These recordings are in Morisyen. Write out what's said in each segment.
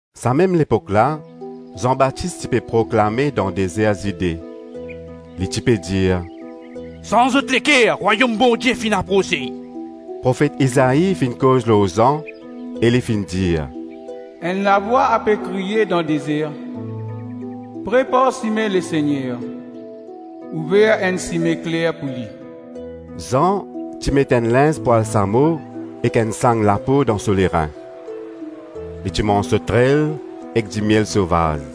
Sa mem lepok la, Zan Batis ti pe proklame dan dezer Zide. Li ti pe dir, “Sanz zot leker, Rwayom Bondie finn aprose.” Profet Izai finn koz lor Zan e li finn dir: ‘Enn lavwa ape kriye dan dezer: prepar sime Lesegner, ouver enn sime kler pou li.’ Zan ti met enn linz pwal samo ek enn sang lapo dan so lerin. Li ti manz sotrel ek dimiel sovaz.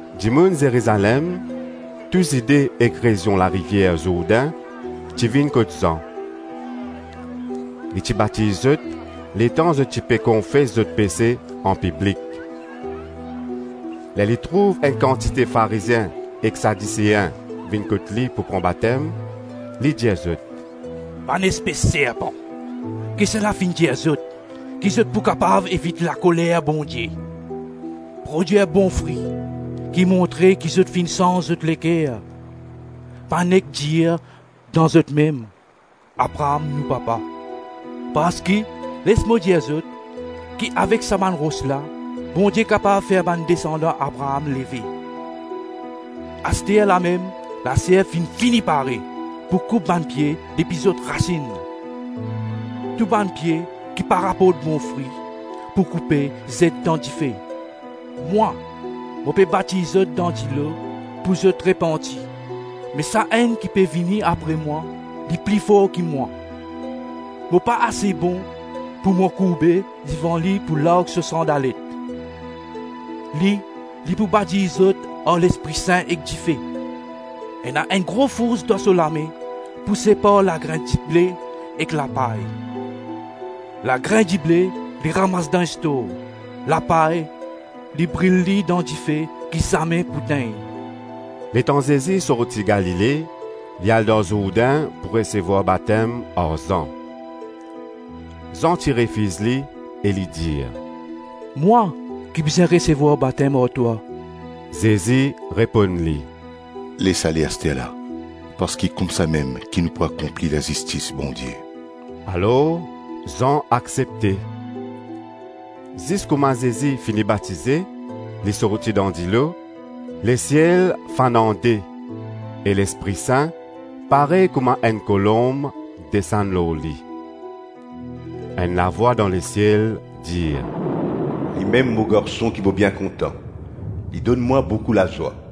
Dimoun Zerizalem, tou Zide ek rezion larivier Zourdin ti vinn kot Zan. Li ti batiz zot letan zot ti pe konfes zot pese anpiblik. Ler li trouv enn kantite Farizien ek Sadisein vinn kot li pou pran batem, li dir zot, “Bann espes serpan, kisannla finn dir zot ki zot pou kapav evit lakoler Bondie.? Prodwir bon fri ki montre ki zot finn sanz zot leker. Pa nek dir dan zotmem, ‘Abraam nou papa!’ Parski les mo dir zot ki avek sa bann ros la, Bondie kapav fer bann desandan Abraam leve. Asterlamem laserp finn fini pare pou koup bann pie depi zot rasinn. Tou bann pie ki pa raport bon fri pou koupe zet dan dife. Mwa, mo pe batiz zot dan dilo pou zot repanti. Me Sa-Enn ki pe vini apre mwa, li pli for ki mwa; mo pa ase bon, pou mo kourbe devan li pou larg so sandalet. Li, li pou batiz zot ar Lespri Sin ek dife. Ena enn gro fours dan so lame pou separ lagrin dible ek lapay. Lagrin dible, li ramas dan stor, lapay, li bril li dan dife ki zame pou tegn.” Letan Zezi sorti Galile, li al dan Zourdin, pou resevwar batem ar Zan. Zan ti refiz li, e li dir, “Mwa ki bizin resevwar batem ar twa.” Zezi reponn li, “Les ale asterla, parski koumsamem ki nou pou akonpli lazistis Bondie.” Alor Zan aksepte. Zis kouma Zezi fini batize, li sorti dan dilo; lesiel fann an-de e Lespri Sin parey kouma enn kolonb desann lor li. Enn lavwa dan lesiel dir, “limem mo Garson ki mo bien kontan; li donn mwa boukou lazwa.”